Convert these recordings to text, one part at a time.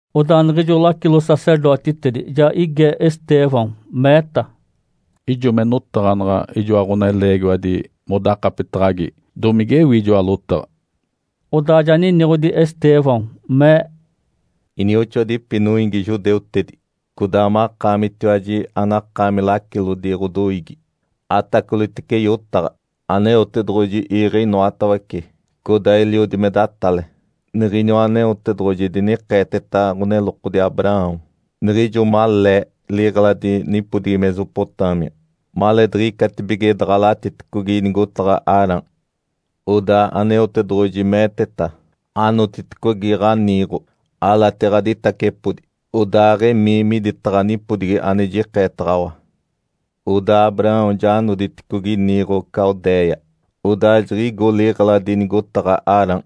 Odaa niɡ̶ijo lacilo-sacerdotitedi ja ige Estêvão, meeta, “Ijo me notaɡ̶anaɡ̶a ijoa ɡ̶oneleegiwadi modakapetaɡ̶agi, domigewi ijoa lotaɡ̶a?” Odaa ja niniɡ̶odi Estêvão, mee, “Inioxoadipi noiigi judeutedi, codaa makaamitiwaji anakaami lacilodi ɡ̶odoiigi, atacolitece yotaɡ̶a! Aneotedoɡ̶oji iiɡ̶e inoatawece codaa eliodi me datale. Niɡ̶iniwa Aneotedoɡ̶oji dinikeeteta ɡ̶onelokodi Abraão niɡ̶ijo malee liɡ̶eladi nipodigi Mesopotâmia, maleediɡ̶icatibige daɡ̶alatiticogi nigotaɡ̶a Harã. Odaa Aneotedoɡ̶oji meeteta, ‘Anotiticogi ɡ̶aniiɡ̶o, alati ɡ̶aditacepodi, odaaɡ̶emii miditaɡ̶a nipodigi ane jikeetaɡ̶awa.’ Odaa Abraão ja noditicogi niiɡ̶o Caldéia, odaa jiɡ̶igo liɡ̶eladi nigotaɡ̶a Harã.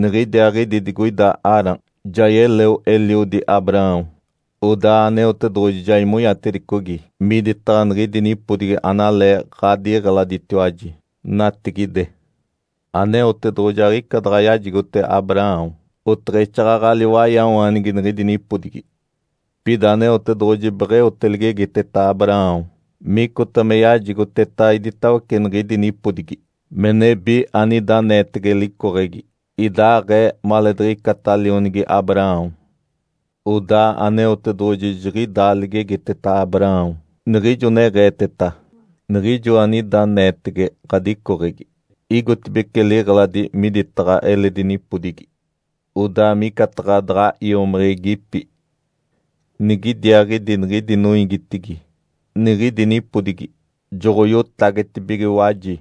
Niɡ̶idiaaɡ̶idi digoida Harã, ja yeleo eliodi Abraão, odaa Aneotedoɡ̶oji ja imonyatedicogi miditaɡ̶a niɡ̶idi nipodigi analee ɡ̶adiɡ̶eladetiwaji natigide. Aneotedoɡ̶oji aɡ̶ica daɡ̶a yajigote Abraão oteɡ̶exaaɡ̶aɡ̶a liwaiawaanigi niɡ̶idi nipodigi. Pida Aneotedoɡ̶oji beɡ̶eote ligegiteta Abraão micota me yajigoteta iditawece niɡ̶idi nipodigi me nebi anida aneetege licoɡ̶egi, idaaɡ̶ee maleediɡ̶icata lionigi Abraão. Odaa Aneotedoɡ̶oji jiɡ̶idaa ligegiteta Abraão niɡ̶ijo neɡ̶eeteta, ‘Niɡ̶ijo anida aneetege ɡ̶adicoɡ̶egi igotibeci liɡ̶eladi miditaɡ̶a eledi nipodigi, odaa micataɡ̶a daɡ̶a iomiɡ̶igipi. Nigidiaaɡ̶idi niɡ̶idi noiigitigi niɡ̶idi nipodigi joɡ̶oiotagetibigiwaji,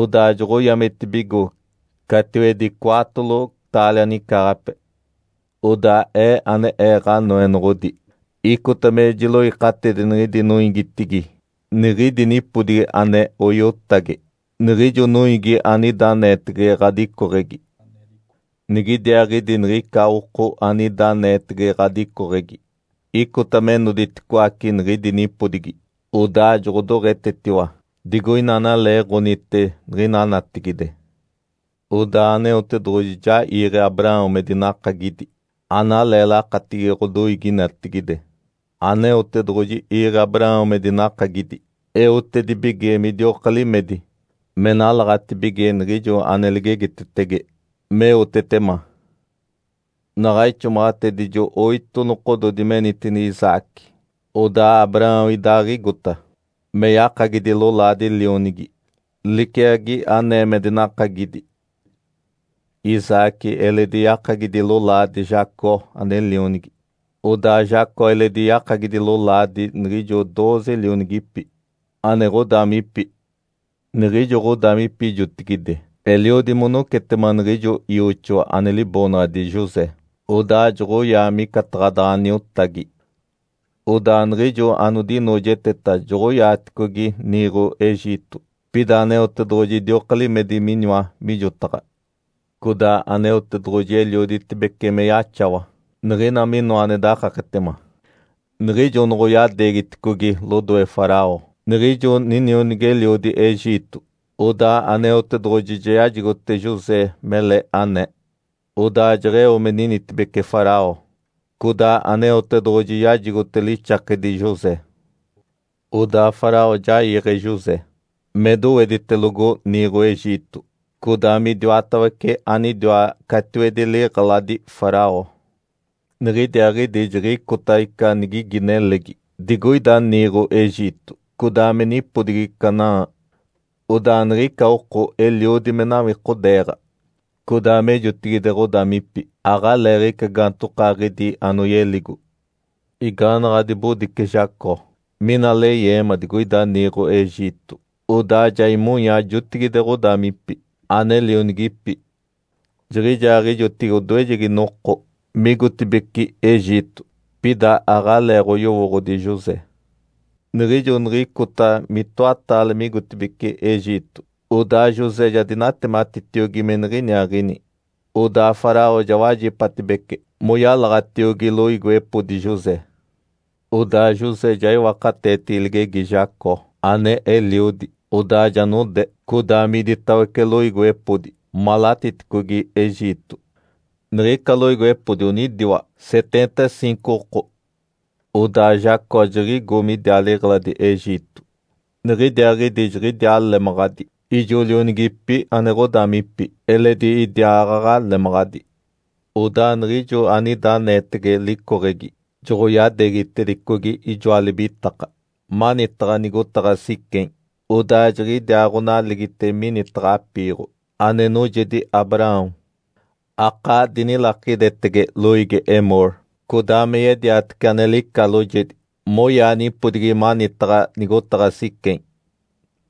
odaa joɡ̶oyametibigo catiwedi cwaatolo taalia nicaaɡ̶ape. Odaa Ee ane Ee Ǥanoenoɡ̶odi icota me jiloikatidi niɡ̶idi noiigitigi niɡ̶idi nipodigi ane oiotage niɡ̶ijo noiigi anida aneetege ɡ̶adicoɡ̶egi. Nigidiaaɡ̶idi niɡ̶ica oko anida aneetege ɡ̶adicoɡ̶egi icota me noditicoaci niɡ̶idi nipodigi, odaa joɡ̶odoɡ̶etetiwa digoina analeeɡ̶onite niɡ̶ina natigide.’ Odaa Aneotedoɡ̶oji ja iiɡ̶e Abraão me dinakagidi analee lakatigi ɡ̶odoiigi natigide. Aneotedoɡ̶oji iiɡ̶e Abraão me dinakagidi eotedibige midioka limedi me nalaɡ̶atibige niɡ̶ijo ane ligegitetege me eotetema. Naɡ̶a ixomaɡ̶atedijo oito nokododi menitini Isaque, odaa Abraão idaaɡ̶igota me yakagidi lolaadi lionigi liciagi anee me dinakagidi. Isaque eledi yakagidi lolaadi Jacó ane lionigi. Odaa Jacó eledi yakagidi lolaadi niɡ̶ijo dooze lionigipi, ane ɡ̶odaamipi. Niɡ̶ijo ɡ̶odaamipi jotigide eliodi monocetema niɡ̶ijo ioxoa ane liboonaɡ̶adi José, odaa joɡ̶oyaa micataɡ̶a daɡ̶a niotagi. Odaa niɡ̶ijo anodinoojeteta joɡ̶oyadeegiticogi niiɡ̶o Egito. Pida Aneotedoɡ̶oji idioka limedi miniwa mijotaɡ̶a. Codaa Aneotedoɡ̶oji elioditibece me yaxawa niɡ̶ina minoa ane dakaketema. Niɡ̶ijo noɡ̶oyadeegiticogi lodoe Faraó, niɡ̶ijo ninionigi-eliodi Egito, odaa Aneotedoɡ̶oji ja yajigote José mele anee, odaa jeɡ̶eo me ninitibece Faraó, codaa Aneotedoɡ̶oji yajigote lixakedi José. Odaa Faraó ja iiɡ̶e José me doweditelogo niiɡ̶o Egito, codaa midiwatawece anidiwa catiwedi liɡ̶eladi Faraó. Niɡ̶idiaaɡ̶idi jiɡ̶icota ica nigigi nelegi digoida niiɡ̶o Egito codaa me nipodigi Canaã. Odaa niɡ̶ica oko eliodi me nawikodeeɡ̶a. Codaa me jotigide ɡ̶odaamipi aɡ̶aleeɡ̶ica gaantokaaɡ̶idi anoyeligo. Igaanaɡ̶a dibodice Jacó mina leyeema digoida niiɡ̶o Egito, odaa ja imonya jotigide ɡ̶odaamipi ane lionigipi. Jiɡ̶ijaaɡ̶ijotigi odoejegi noko migotibeci Egito, pida aɡ̶aleeɡ̶oyowooɡ̶odi José. Niɡ̶ijo niɡ̶icota mitoataale migotibeci Egito, odaa José ja dinatematitiogi me niɡ̶iniaaɡ̶ini. Odaa Faraó ja wajipatibece moyalaɡ̶atiogi loiigiwepodi José. Odaa José ja iwakateetigi ligegi Jacó ane eliodi, odaa ja node codaa miditawece loiigiwepodi malatiticogi Egito. Niɡ̶ica loiigiwepodi onidiwa seteenta ciinco oko. Odaa Jacó jiɡ̶igo midiaa liɡ̶eladi Egito. Niɡ̶idiaaɡ̶idi jiɡ̶idiaa lemaɡ̶adi, ijo lionigipi ane ɡ̶odaamipi, eledi idiaaɡ̶aɡ̶a lemaɡ̶adi. Odaa niɡ̶ijo anida aneetege licoɡ̶egi joɡ̶oyadeegitedicogi ijoa libitaka manitaɡ̶a nigotaɡ̶a Siquém, odaa jiɡ̶idiaaɡ̶onaligite minitaɡ̶a apiiɡ̶o ane noojedi Abraão. Akaa dinilakidetege loiigi Emor, codaa me yediatece ane lica loojedi moyaa nipodigi manitaɡ̶a nigotaɡ̶a Siquém.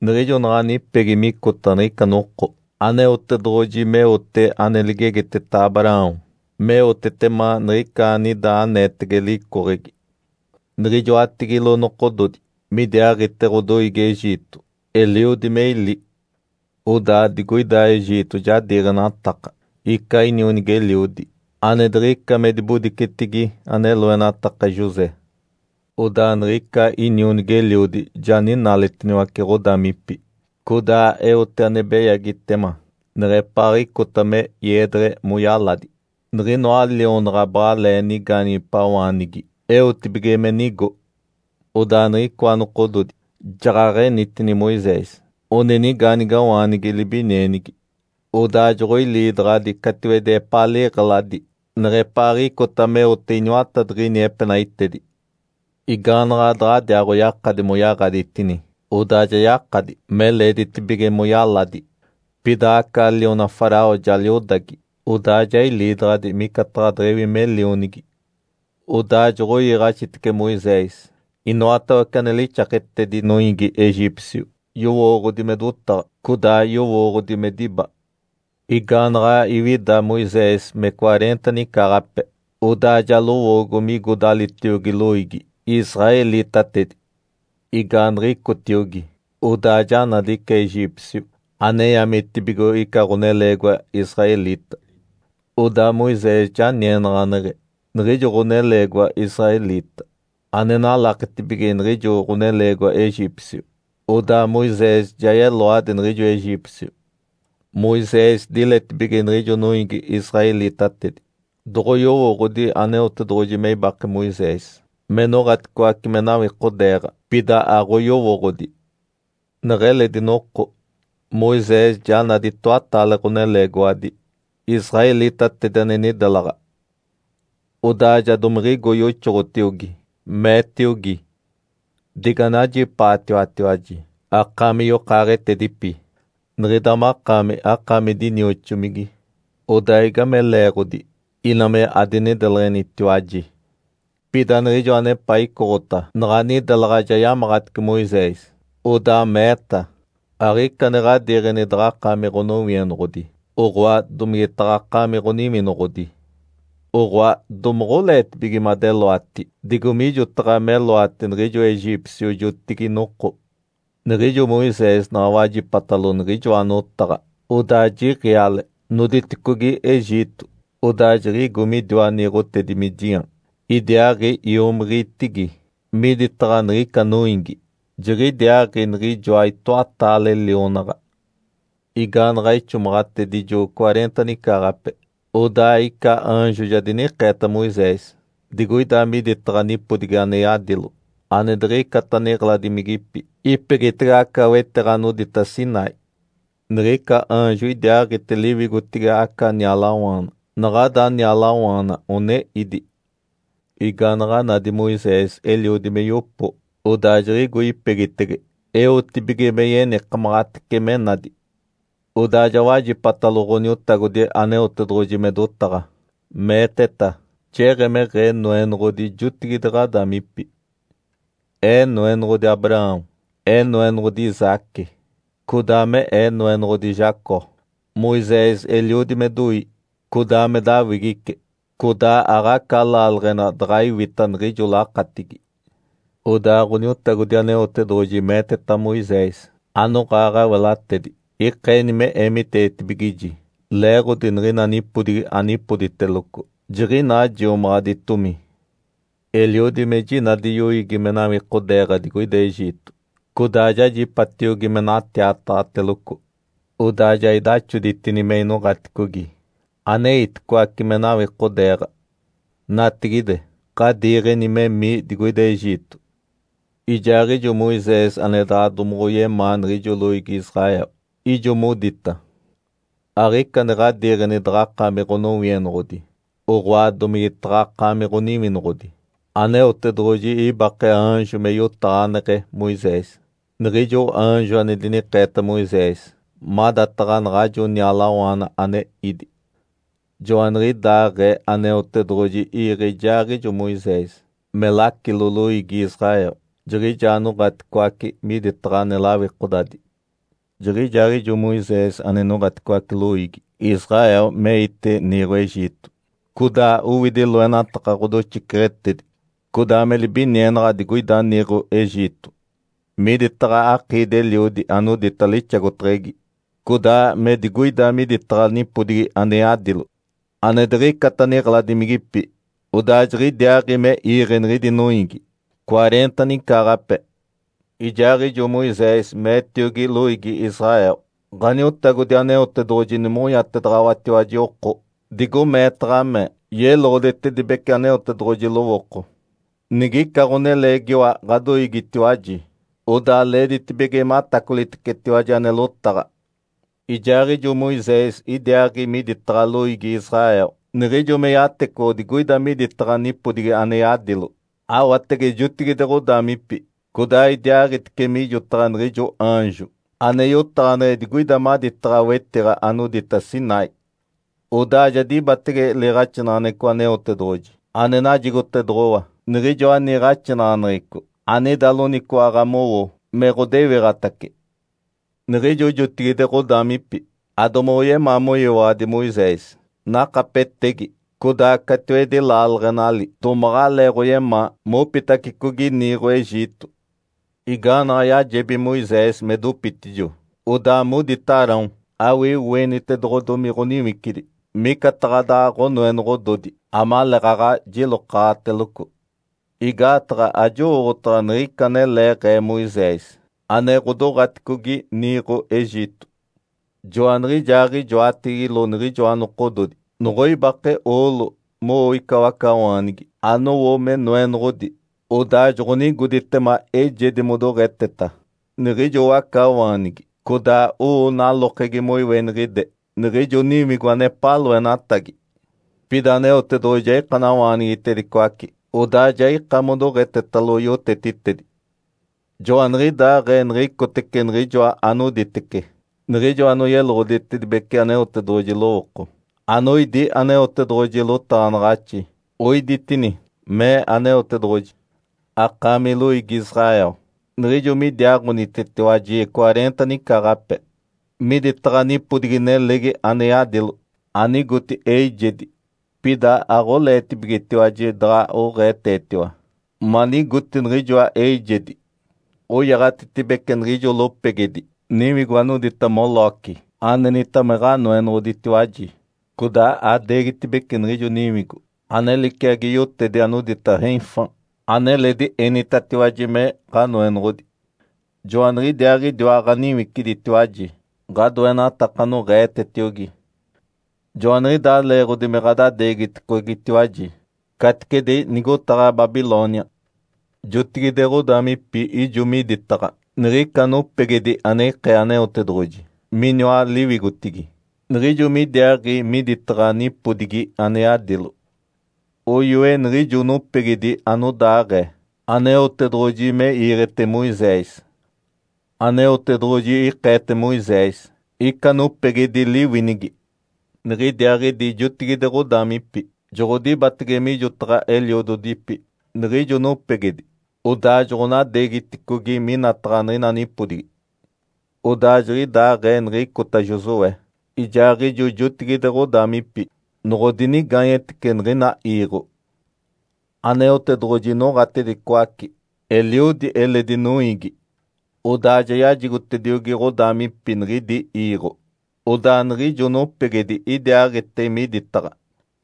Niɡ̶ijo naɡ̶a nipegi micota niɡ̶ica noko Aneotedoɡ̶oji meote ane ligegiteta Abraão meotetema niɡ̶ica anida aneetege licoɡ̶egi. Niɡ̶ijoatigilo nokododi midiaaɡ̶ite ɡ̶odoiigi Egito eliodi me ili. Odaa digoida Egito ja diiɡ̶enataka ica inionigi-eliodi ane diɡ̶ica me dibodicetigi ane loenataka José. Odaa niɡ̶ica inionigi-eliodi ja ninaaletiniwace ɡ̶odaamipi, codaa eote ane beyagitema neɡ̶epaaɡ̶icota me iedeɡ̶e moyaladi niɡ̶inoa lionaɡ̶a baɡ̶alee nigaanigipawaanigi, eotibige me nigo. Odaa niɡ̶icoa nokododi jaɡ̶aɡ̶enitini Moisés. One nigaanigawaanigi libinienigi. Odaa joɡ̶oiliidaɡ̶adi catiwedi epaa liɡ̶eladi neɡ̶epaaɡ̶icota meote iniwatadiɡ̶ini nepenaitedi. Igaanaɡ̶a daɡ̶adiaaɡ̶oyakadi moyaɡ̶aditini, odaa ja yakadi me leeditibige moyaladi, pida aca liona Faraó ja liodagi, odaa ja iliidaɡ̶adi micataɡ̶a deɡ̶ewi lionigi. Odaa joɡ̶oiiɡ̶axitece Moisés inoatawece ane lixaketedi noiigi Egípcio, yowooɡ̶odi me dotaɡ̶a, codaa yowooɡ̶odi me diba. Igaanaɡ̶a iwida Moisés me cwareenta nicaaɡ̶ape, odaa ja lowoogo migo dalitiogi loiigi, israelitatedi. Igaaniɡ̶icotiogi, odaa ja nadi ica Egípcio ane yametibigo ica ɡ̶oneleegiwa israelita. Odaa Moisés ja nienaɡ̶aneɡ̶e niɡ̶ijo ɡ̶oneleegiwa israelita ane nalaketibige niɡ̶ijo ɡ̶oneleegiwa Egípcio, odaa Moisés ja yeloadi niɡ̶ijo Egípcio. Moisés diletibige niɡ̶ijo noiigi israelitatedi doɡ̶oyowooɡ̶odi Aneotedoɡ̶oji me ibake Moisés me noɡ̶aticoace me nawikodeeɡ̶a, pida aɡ̶oyowooɡ̶odi. Neɡ̶eledi noko, Moisés ja nadi itoataale ɡ̶oneleegiwadi israelitatedi ane nidelaɡ̶a. Odaa ja domiɡ̶igo yoxoɡ̶otiogi, meetiogi, ‘Diganajipaatiwatiwaji akaami yokaaɡ̶etedipi! Niɡ̶ida makaami, akaami dinioxomigi. Odaa igame leeɡ̶odi ina me adinideleɡ̶enitiwaji?’ Pida niɡ̶ijo anepaa icoɡ̶ota naɡ̶a nidelaɡ̶a ja yamaɡ̶atice Moisés, odaa meeta, ‘Aɡ̶ica ane ɡ̶adiiɡ̶eni daɡ̶akaami ɡ̶onowienoɡ̶odi, oɡ̶oa, domigetaɡ̶akaami ɡ̶oniwinoɡ̶odi. Oɡ̶oa, domoɡ̶oleetibige madeloati digo mijotaɡ̶a meloati niɡ̶ijo Egípcio jotigi-noko?’ Niɡ̶ijo Moisés naɡ̶a wajipatalo niɡ̶ijoa notaɡ̶a, odaa jiɡ̶iale, noditicogi Egito, odaa jiɡ̶igo midiwa niiɡ̶otedi Midiã idiaaɡ̶i iomiɡ̶igitigi miditaɡ̶a niɡ̶ica noiigi. Jiɡ̶idiaaɡ̶i niɡ̶ijoa itoataale lionaɡ̶a. Igaanaɡ̶a ixomaɡ̶atedijo cwareenta nicaaɡ̶ape, odaa ica aanjo ja dinikeeta Moisés digoida miditaɡ̶a nipodigi ane yadilo ane diɡ̶icata niɡ̶eladimigipi ipegitege aca wetiɡ̶a anodita Sinai. Niɡ̶ica aanjo idiaaɡ̶ite liwigotigi aca nialawaana, naɡ̶ada nialawaana one ídi. Igaanaɡ̶a nadi Moisés eliodi me yopo, odaa jiɡ̶igo ipegitege eotibige me yenikamaɡ̶atece me nadi. Odaa ja wajipatalo Ǥoniotagodi Aneotedoɡ̶oji me dotaɡ̶a, meeteta, ‘Jeɡ̶emeɡ̶ee Noenoɡ̶odi jotigide ɡ̶adaamipi. Ee Noenoɡ̶odi Abraão, Ee Noenoɡ̶odi Isaque, codaa me Ee Noenoɡ̶odi Jacó.’ Moisés eliodi me doi, codaa me dawigice. Codaa aɡ̶aca laaleɡ̶ena daɡ̶a iwita niɡ̶ijo lakatigi. Odaa Ǥoniotagodi Aneotedoɡ̶oji meeteta Moisés, ‘Anoɡ̶aa ɡ̶awelatedi ikeeni me eemiteetibigiji, leeɡ̶odi niɡ̶ina nipodigi anipoditeloco jiɡ̶inaa jiomaɡ̶aditomi. Eliodi me jinadi yoiigi me nawikodeeɡ̶a digoida Egito, codaa jajipatiogi me natiataɡ̶ateloco. Odaa ja idaxoditini me inoɡ̶aticogi aneiticoace me nawikodeeɡ̶a. Natigide, ɡ̶adiiɡ̶eni memii digoida Egito.’ Ijaaɡ̶ijo Moisés ane daɡ̶a domoɡ̶oyemaa niɡ̶ijo loiigi Israel, ijo modita, ‘Aɡ̶ica ane ɡ̶adiiɡ̶eni daɡ̶akaami ɡ̶onowienoɡ̶odi, oɡ̶oa, domigetaɡ̶akaami ɡ̶oniwinoɡ̶odi!’ Aneotedoɡ̶oji ibake aanjo me yotaɡ̶aneɡ̶e Moisés, niɡ̶ijo aanjo ane dinikeeta Moisés madataɡ̶a naɡ̶ajo nialawaana ane ídi. Joaniɡ̶idaaɡ̶ee Aneotedoɡ̶oji iiɡ̶e ijaaɡ̶ijo Moisés me lacilo loiigi Israel, jiɡ̶ijaa noɡ̶aticoace miditaɡ̶a ane lawikodadi. Jiɡ̶ijaaɡ̶ijo Moisés ane noɡ̶aticoace loiigi Israel meite niiɡ̶o Egito, codaa owidi loenataka ɡ̶odoxiceɡ̶etedi codaa me libinienaɡ̶a digoida niiɡ̶o Egito, miditaɡ̶a akiidi-eliodi anodita ‘Lixagoteɡ̶egi’, codaa me digoida miditaɡ̶a nipodigi ane yadilo ane diɡ̶icata niɡ̶eladimigipi. Odaa jiɡ̶idiaaɡ̶i me iiɡ̶e niɡ̶idi noiigi cwareenta nicaaɡ̶ape. Ijaaɡ̶ijo Moisés meetiogi loiigi Israel, ‘Ǥaniotagodi Aneotedoɡ̶oji nimonyatedaɡ̶awatiwaji oko digo meetaɡ̶a me yeloɡ̶oditedibece Aneotedoɡ̶oji lowooko. Niɡ̶ica ɡ̶oneleegiwa ɡ̶adoiigitiwaji, odaa leeditibige matacolitecetiwaji ane lotaɡ̶a.’ Ijaaɡ̶ijo Moisés idiaaɡ̶i miditaɡ̶a loiigi Israel niɡ̶ijo me yatecoɡ̶o digoida miditaɡ̶a nipodigi ane yadilo. Awatege jotigide ɡ̶odaamipi, codaa idiaaɡ̶itice mijotaɡ̶a niɡ̶ijo aanjo ane yotaɡ̶aneɡ̶e digoida maditaɡ̶a wetiɡ̶a anodita Sinai. Odaa ja dibatege liiɡ̶axinaɡ̶aneɡ̶eco Aneotedoɡ̶oji ane najigotedoɡ̶owa, niɡ̶ijoa niiɡ̶axinaɡ̶aneɡ̶eco anida loniciwaɡ̶a mowo me ɡ̶odewiɡ̶atace. Niɡ̶ijo jotigide ɡ̶odaamipi adomoɡ̶oyemaa moyiwaɡ̶adi Moisés, nakapetegi, codaa catiwedi laaleɡ̶enali domaɡ̶aleeɡ̶oyemaa mopitacicogi niiɡ̶o Egito. Igaanaɡ̶a yajebi Moisés me dopitijo, odaa modita Arão, ‘Awii oenitedoɡ̶odomi ɡ̶oniwicidi micataɡ̶a daɡ̶a ɡ̶onoenoɡ̶ododi amaleeɡ̶aɡ̶a jilokaɡ̶ateloco. Igaataɡ̶a ajowooɡ̶otaɡ̶a niɡ̶ica analeeɡ̶ee Moisés ane ɡ̶odoɡ̶aticogi niiɡ̶o Egito.’ Joaniɡ̶ijaaɡ̶ijoatigilo niɡ̶ijoa nokododi noɡ̶oibake oolo mowo ica wacawaanigi anowo me noenoɡ̶odi, odaa joɡ̶onigoditema eijedi modoɡ̶eteta niɡ̶ijo wacawaanigi, codaa owo nalokegi moiweniɡ̶ide niɡ̶ijo niwigo anepaa loenatagi. Pida Aneotedoɡ̶oji ja ikanawaanigitedicoace, odaa ja ika modoɡ̶etetalo yotetitedi. Joaniɡ̶idaaɡ̶ee niɡ̶icotece niɡ̶ijoa anoditece niɡ̶ijo anoyeloɡ̶oditedibece Aneotedoɡ̶oji lowooko, anoidi Aneotedoɡ̶oji lotaɡ̶anaɡ̶axi, oiditini, mee Aneotedoɡ̶oji, ‘Akaami loiigi Israel, niɡ̶ijo midiaaɡ̶onitetiwaji cwareenta nicaaɡ̶ape miditaɡ̶a nipodigi nelegi ane yadilo, anigoti eijedi, pida aɡ̶oleetibigetiwaji daɡ̶a oɡ̶eetetiwa manigoti niɡ̶ijoa eijedi. Oyaɡ̶atitibece niɡ̶ijo lopegedi niwigo anodita Moloque anenita me ɡ̶anoenoɡ̶oditiwaji, codaa adeegitibece niɡ̶ijo niwigo ane liciagi yotedi anodita Renfã aneledi enitatiwaji me ɡ̶anoenoɡ̶odi. Joaniɡ̶idiaaɡ̶idiwa ɡ̶aniwiciditiwaji ɡ̶adoenataka anoɡ̶eetetiogi. Joaniɡ̶idaa leeɡ̶odi me ɡ̶adadeegiticogitiwaji caticedi nigotaɡ̶a Babilônia.’ Jotigide ɡ̶odaamipi ijo miditaɡ̶a niɡ̶ica nopegedi ane ikee Aneotedoɡ̶oji miniwa liwigotigi niɡ̶ijo midiaaɡ̶i miditaɡ̶a nipodigi ane yadilo. Oyoe niɡ̶ijo nopegedi anodaaɡ̶ee Aneotedoɡ̶oji me iiɡ̶ete Moisés. Aneotedoɡ̶oji ikeete Moisés ica nopegedi liwinigi. Niɡ̶idiaaɡ̶idi jotigide ɡ̶odaamipi joɡ̶odibatege mijotaɡ̶a eliododipi niɡ̶ijo nopegedi, odaa joɡ̶onadeegiticogi minataɡ̶a niɡ̶ina nipodigi. Odaa jiɡ̶idaaɡ̶ee niɡ̶icota Josué ijaaɡ̶ijo jotigide ɡ̶odaamipi noɡ̶odinigaanyetece niɡ̶ina iiɡ̶o. Aneotedoɡ̶oji noɡ̶atedicoace eliodi eledi noiigi, odaa ja yajigotediogi ɡ̶odaamipi niɡ̶idi iiɡ̶o. Odaa niɡ̶ijo nopegedi idiaaɡ̶ite miditaɡ̶a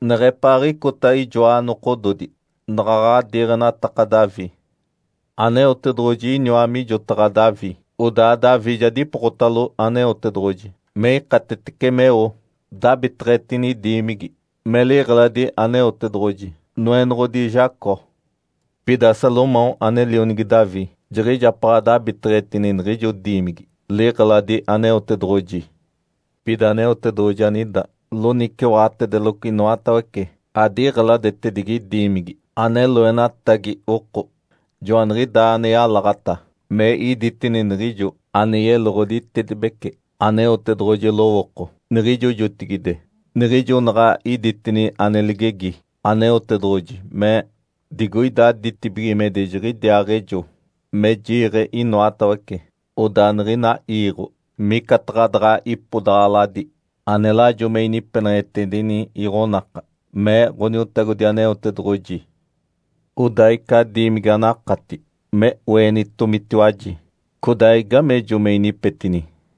neɡ̶epaaɡ̶icota ijoa nokododi naɡ̶aɡ̶a diiɡ̶enataka Davi. Aneotedoɡ̶oji iniwa mijotaɡ̶a Davi, odaa Davi ja dipokotalo Aneotedoɡ̶oji me ikatetece meo dabiteɡ̶etini diimigi me liɡ̶eladi Aneotedoɡ̶oji, Noenoɡ̶odi Jacó. Pida Salomão ane lionigi Davi jiɡ̶ijapaɡ̶a dabiteɡ̶etini niɡ̶ijo diimigi, liɡ̶eladi Aneotedoɡ̶oji. Pida Aneotedoɡ̶oji anida loniciwaɡ̶atedeloco inoatawece adiɡ̶eladetedigi diimigi ane loenatagi oko. Joaniɡ̶idaa ane yalaɡ̶ata me iditini niɡ̶ijo ane yeloɡ̶oditedibece Aneotedoɡ̶oji lowooko niɡ̶ijo jotigide, niɡ̶ijo naɡ̶a iditini ane ligegi Aneotedoɡ̶oji, mee, ‘ “Digoida ditibigimedi jiɡ̶idiaaɡ̶ejo me jiiɡ̶e inoatawece, odaa niɡ̶ina iiɡ̶o micataɡ̶a daɡ̶a ipodaɡ̶aladi ane lajo me inipeneɡ̶etedini iɡ̶onaka”, mee Ǥoniotagodi Aneotedoɡ̶oji. “Odaa ica diimigi anakati me oenitomitiwaji? Codaa igamejo me inipetini?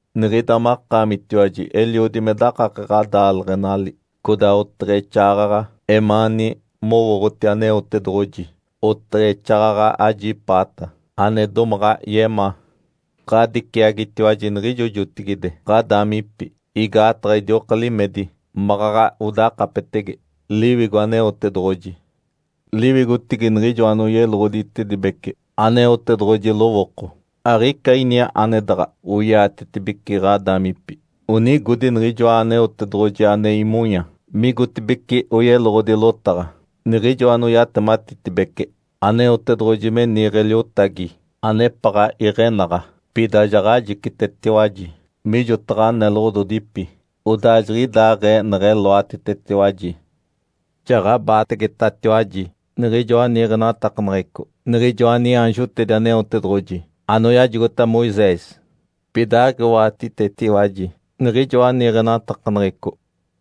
Estêvão eɡ̶idaaɡ̶ee me dotaɡ̶a, mee, “Niɡ̶ida makaamitiwaji eliodi me dakake ɡ̶adaaleɡ̶enali, codaa oteɡ̶exaaɡ̶aɡ̶a emaani mowooɡ̶oti Aneotedoɡ̶oji, oteɡ̶exaaɡ̶aɡ̶a ajipaata ane domaɡ̶a yemaa. Ǥadiciagitiwaji niɡ̶ijo jotigide ɡ̶adaamipi igaataɡ̶a idioka limedi maɡ̶aɡ̶a odakapetege Liwigo Aneotedoɡ̶oji. Liwigotigi niɡ̶ijo anoyeloɡ̶oditedibece Aneotedoɡ̶oji lowooko aɡ̶ica ini ane daɡ̶a oiatetibeci ɡ̶adaamipi. Onigodi niɡ̶ijoa Aneotedoɡ̶oji ane imonya migotibeci oyeloɡ̶odi lotaɡ̶a, niɡ̶ijo anoyatematitibece Aneotedoɡ̶oji me niiɡ̶e Liotagi anepaɡ̶a iɡ̶enaɡ̶a. Pida jaɡ̶ajicitetiwaji mijotaɡ̶a neloɡ̶ododipi, odaa jiɡ̶idaaɡ̶ee neɡ̶eloatitetiwaji. Jaɡ̶abaategetatiwaji niɡ̶ijoa niiɡ̶enatakaneɡ̶eco niɡ̶ijoa niaanjotedi Aneotedoɡ̶oji anoyajigota Moisés. Pida aɡ̶iwaɡ̶atitetiwaji niɡ̶ijoa niiɡ̶enatakaneɡ̶eco.”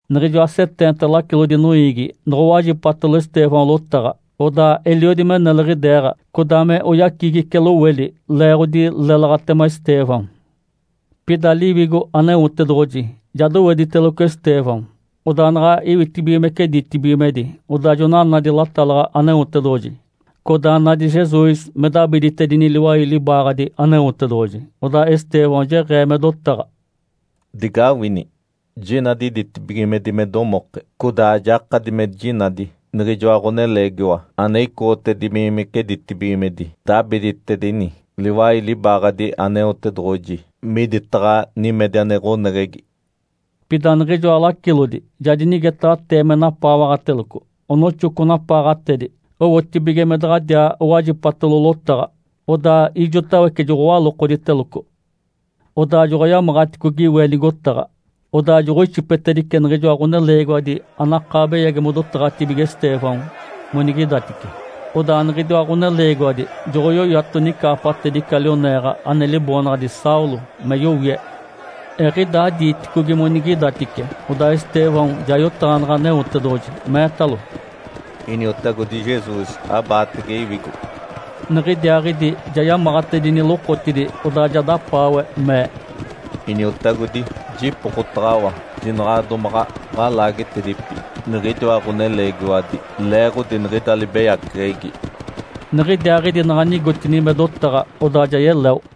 Niɡ̶ijoa seteenta lacilodi noiigi noɡ̶owajipatalo Estêvão lotaɡ̶a, odaa eliodi me neliɡ̶ideeɡ̶a, codaa me oyacigice loweli, leeɡ̶odi lélaɡ̶atema Estêvão. Pida Liwigo Aneotedoɡ̶oji ja dowediteloco Estêvão, odaa naɡ̶a iwitibigimece ditibigimedi, odaa jona nadi latalaɡ̶a Aneotedoɡ̶oji, codaa nadi Jesus me dabiditedini liwai libaaɡ̶adi Aneotedoɡ̶oji. Odaa Estêvão jeɡ̶ee me dotaɡ̶a, “Digawini! Jinadi ditibigimedi me domoke, codaa jakadi me jinadi niɡ̶ijoa Ǥoneleegiwa ane icoɡ̶otibigimece ditibigimedi, dabiditini liwai libaaɡ̶adi Aneotedoɡ̶oji miditaɡ̶a nimedi ane ɡ̶oneɡ̶egi.” Pida niɡ̶ijoa lacilodi ja dinigetaɡ̶atee me napaawaɡ̶ateloco, onoxoco napaaɡ̶atedi owotibige me daɡ̶adiaa owajipatalo lotaɡ̶a. Odaa ijotawece joɡ̶owalokoditeloco. Odaa joɡ̶oyamaɡ̶aticogi we nigotaɡ̶a, odaa joɡ̶oixipetedice niɡ̶ijoa ɡ̶oneleegiwadi anakaa beyagi modotaɡ̶atibige Estêvão monigidatice. Odaa niɡ̶idiwa ɡ̶oneleegiwadi joɡ̶oyoyato nicaapatedi ica lioneeɡ̶a ane liboonaɡ̶adi Saulo me yowie. Eɡ̶idaa diiticogi monigidatice, odaa Estêvão ja yotaɡ̶aneɡ̶e Aneotedoɡ̶oji, meetalo, “Iniotagodi Jesus, abaatege iwigo.” Niɡ̶idiaaɡ̶idi ja yamaɡ̶atedini lokotidi, odaa ja dapaawe, mee, “Iniotagodi, jipokotaɡ̶awa jinaɡ̶a domaɡ̶a ɡ̶alaagetedipi niɡ̶idiwa ɡ̶oneleegiwadi leeɡ̶odi niɡ̶ida libeyaceɡ̶egi.” Niɡ̶idiaaɡ̶idi naɡ̶a nigotini me dotaɡ̶a, odaa ja yeleo.